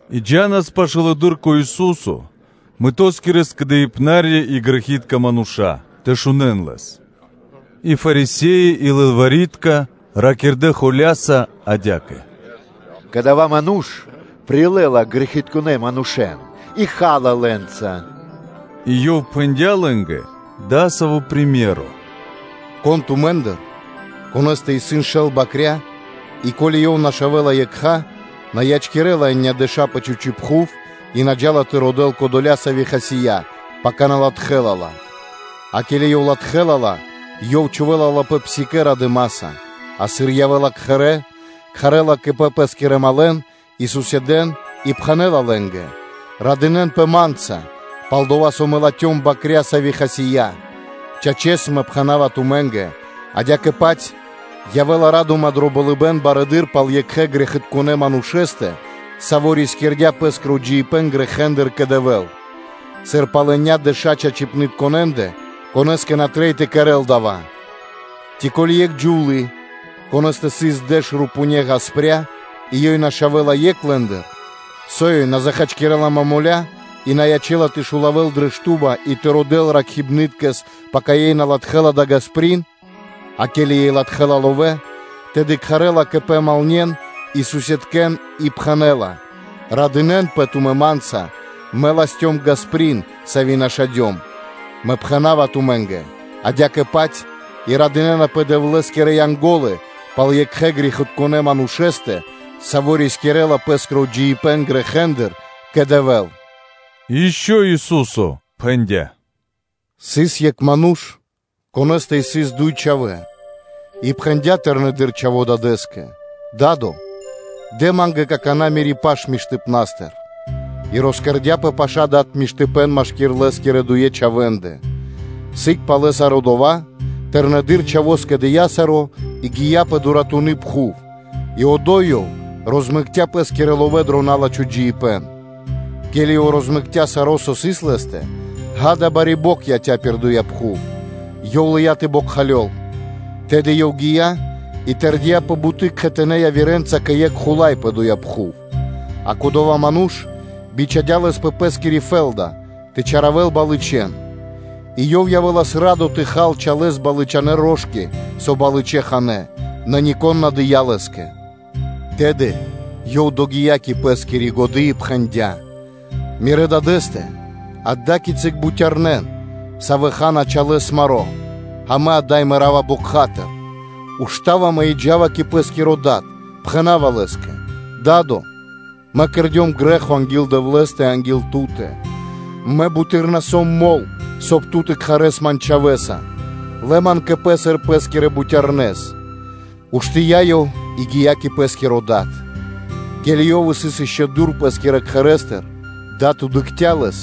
И джа́нас пашылэды́р кэ Ису́со мытоскирэ скэдыбнарья и грэхи́тка мануша́ тэ шунэ́н Лэс: и Фарисе́и и лылвари́тка ракирдэ́ холя́са адя́кэ: “Кадава́ ману́ш прилэ́ла грэхитконэ́ манушэ́н и ха́ла лэ́нца.” И Ёв пхэндя́ лэ́нгэ дасаво приме́ро (сыкаибэ́н): ‘Кон тумэ́ндыр, конэ́стэ исын шэл бакря́, и ко́ли ёв нашавэла екха, на ячкирэ́ла енядэша пэ чхучи́ пхув и на джа́ла тэ родэ́л кодоля, сави́ хасия́, пака латхэ́ла ла. А ке́ли ёв латхэ́ла ла, ёв чхувэ́ла ла пэ псикэ́ радыма́са; а сыр ёв явэ́ла кхэрэ́, кхарэ́ла кэ пэ пэ́скирэ другэн (малэ́н) и суседэ́н (котарье́н) и пхэнэ́ла лэ́нгэ: “Радынэ́нпэ Ма́нца, пал-дова́ со Мэ латхём бакря́, сави́ хасия́.” Чачэс, Мэ пхэна́ва ту́кэ: адя́кэ-паць явэ́ла буты́р ра́дыма дро болыбэ́н пал екхэ грэхитконэ́ манушэ́стэ, саво́ рискирдя́ пэ́скиро джиибэ́н грэхэ́ндыр кэ Дэвэ́л, сыр пал енядэша еня́ чачипнытконэндэ, конэ́скэ на трэй тэ кэрэ́л дава́. Ци ко́ли екх джувлы́, конэ́стэ сыс дэш рупувэ́ ґаспря (копейки) и ёй нашавэла екх лэ́ндыр; со ёй на захачкирэла момоля и на ячэ́ла тэ шулавэл дрэ шту́ба и тэ родэ́л ракхибны́ткэс, пака ёй латхэ́ла дая́ ґасприн? А ке́ли ёй латхэ́ла ловэ́, тэды кхарэ́ла кэ пэ подругэ́н (малне́н) и суседкэн (котаркэн) и пхэнэ́ла: ‘Радынэ́нпэ тумэ́ Ма́нца, мэ латхём ґасприн, сави́ нашадём.’” Мэ пхэна́ва тумэ́нгэ: адя́кэ-паць и радынэ́напэ Дэвлэ́скирэ Янго́лы пал екхэ грэхитконэ́ манушэ́стэ, саво́ рискирэ́ла пэ́скиро джиибэ́н грэхэ́ндыр кэ Дэвэ́л.” И ишчо (инкэ́) Ису́со пхэндя́: “Сыс екх ману́ш, конэ́стэ сыс дуй чхавэ́; и пхэндя́ тэрнэдыр чхаво́ дадэ́скэ: ‘Да́до, дэ ма́нгэ какана́ мири́ паш миштыпна́стыр’. И росчхудя́ дад миштыпэ́н машки́р лэ́скирэ дуе чхавэ́ндэ. Сыг пало́ саро́ дава́, тырнэдыр чхаво́ скэдыя́ саро́ и гия́ пэ дуратуны пхув и одо́й ёв розмэкця пэ́скирэ ловэ́ дро розмэкно джиибэ́н. Ке́ли ёв розмэкця саро́, со сыс лэ́стэ, ґа́да, бари бокх яця́ пир доя́ пхув; ёв лыя́ тэ бокхалёл; тэды ёв гия́ и тэрдия́ пэ буты́ кхэтанэ́ явирэнца кэ екх хула́й пэ доя́ пхув, а кодова́ ману́ш бичхадя́ лэс пэ пэ́скири фэ́лда тэ чаравэл балычэн; и ёв явэ́лас радо тэ хал чалэ́с балычанэ рошки, со балычэ ханэ́, нэ нико́н на дыя́ лэ́скэ. Тэды ёв догия́ кэ пэ́скири годы́ и пхэндя́: ‘Мирэ́ дадэ́стэ исын ада́кицы бутярнэ́, савэ́ ха́на чалэ́с маро́, а мэ ада́й мэра́ва бокха́тыр! Уштава мэ и джа́ва кэ пэ́скиро дад, пхэна́ва лэ́скэ: ‘Да́до! Мэ кэрдём грэ́хо анги́л Дэвлэ́стэ и анги́л ту́тэ. Мэ буты́р на сом мол, соб (кай) ту тэ кхарэс ман чхавэ́са; лэ ман кэ пэ сыр пэ́скирэ бутярнэс.’ Уштыя́ ёв и гия́ кэ пэ́скиро дад. Ке́ли ёв сыс ишчо (инкэ́) дур пэ́скирэ кхэрэ́стыр, дад дыкхця́ лэс;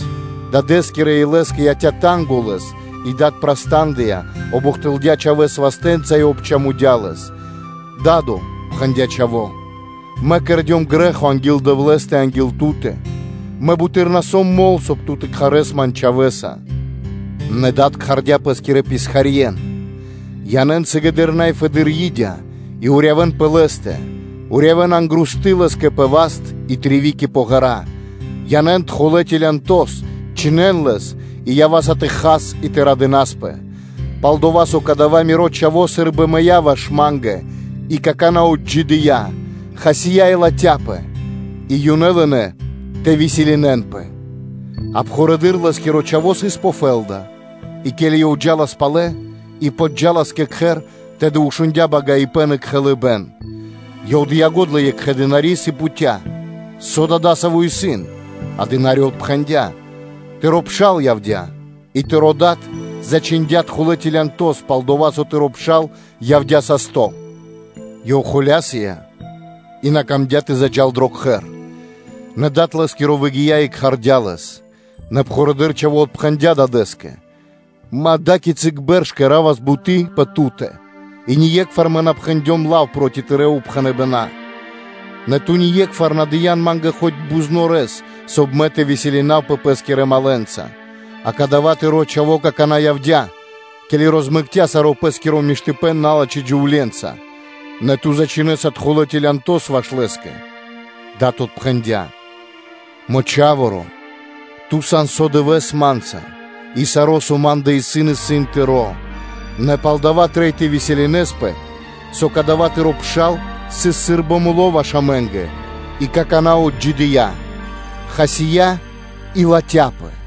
дадэ́скирэ илэскэ яця́ танго лэс и дад праста́ндыя, обухтылдя чхавэ́с вастэ́нца и обчамудя лэс. ‘Да́до, – пхэндя́ чхаво́, – мэ кэрдём грэ́хо анги́л Дэвлэ́стэ и анги́л ту́тэ. Мэ буты́р на сом мол, соб (кай) ту тэ кхарэс ман чхавэ́са.’ Нэ дад кхардя́ пэ́скирэ писхарье́н: ‘Янэ́н сыгэды́р най фэдэды́р урибэ́н и урьявэн пэ лэ́стэ. Урьявэн ангрусты лэ́скэ пэ васт и тривики пэ ґэра́. Янэ́н тхулэ целянтос, чхинэн лэс и ява́са тэ хас и тэ радынаспэ, пал-дова́ со кадава́ миро чхаво́ сы́рбы мыя́ ваш ма́нгэ и какана́ отджидыя́, хасия́ и латхяпэ’. И ёнэ лынэ́ тэ веселинэнпэ (тэ лошалён). А пхурэды́р лэ́скиро чхаво́ сыс пэ фэ́лда: и ке́ли ёв джа́лас палэ и джа́лас пашы́л кэ кхэр, тэды шундя́ багаибэн и кхэлыбэн. Ёв дыя́ го́дла екхэ дынари́с и пхуця́, со дой дасаво сыс? А дына́ри отпхэндя́: ‘Тыро́ пшал явдя́ и тыро́ дад зачхиндя́ тхулэ целянтос, пал-дова́ со тыро́ пшал явдя́ састо́’. Ёв холя́сыя и на камдя́ тэ заджа́л дро кхэр. Нэ дад лэ́скиро выгия́ и кхардя́ лэс. Нэ пхурэды́р чхаво́ отпхэндя́ дадэ́скэ: ‘Мэ ада́кицы бэрш кэра́ва буты́ пэ ту́тэ и ние́кхвар на пхэндём лав проти тырэ́ упхэныбэна́. Нэ ту ние́кхвар на дыя́н ма́нгэ хоць бузнорэс (козлёнкос), соб (кай) мэ тэ веселинавпэ (тэ лошалёвав) пэ́скирэ малэ́нца; а кадава́ тыро́ чхаво́ какана́ явдя́, ке́ли розмэкця саро́ пэ́скиро миштыпэ́н налачхэ́ джувле́нца; нэ ту ж зачхиндя́ тхулэ целянтос ваш лэ́скэ’. Дад отпхэндя́: ‘Мо чхаворо́! Ту сан со дывэ́с Ма́нца, и саро́, со ма́ндэ исын, исын тыро́; нэ палдава́ трэй тэ веселинаспэ (тэ лошалёвас), со кадава́ тыро́ пшал сыс сы́рбы муло́ ваш амэ́нгэ и какана́ отджидыя́, хасия́ и латхяпэ.’”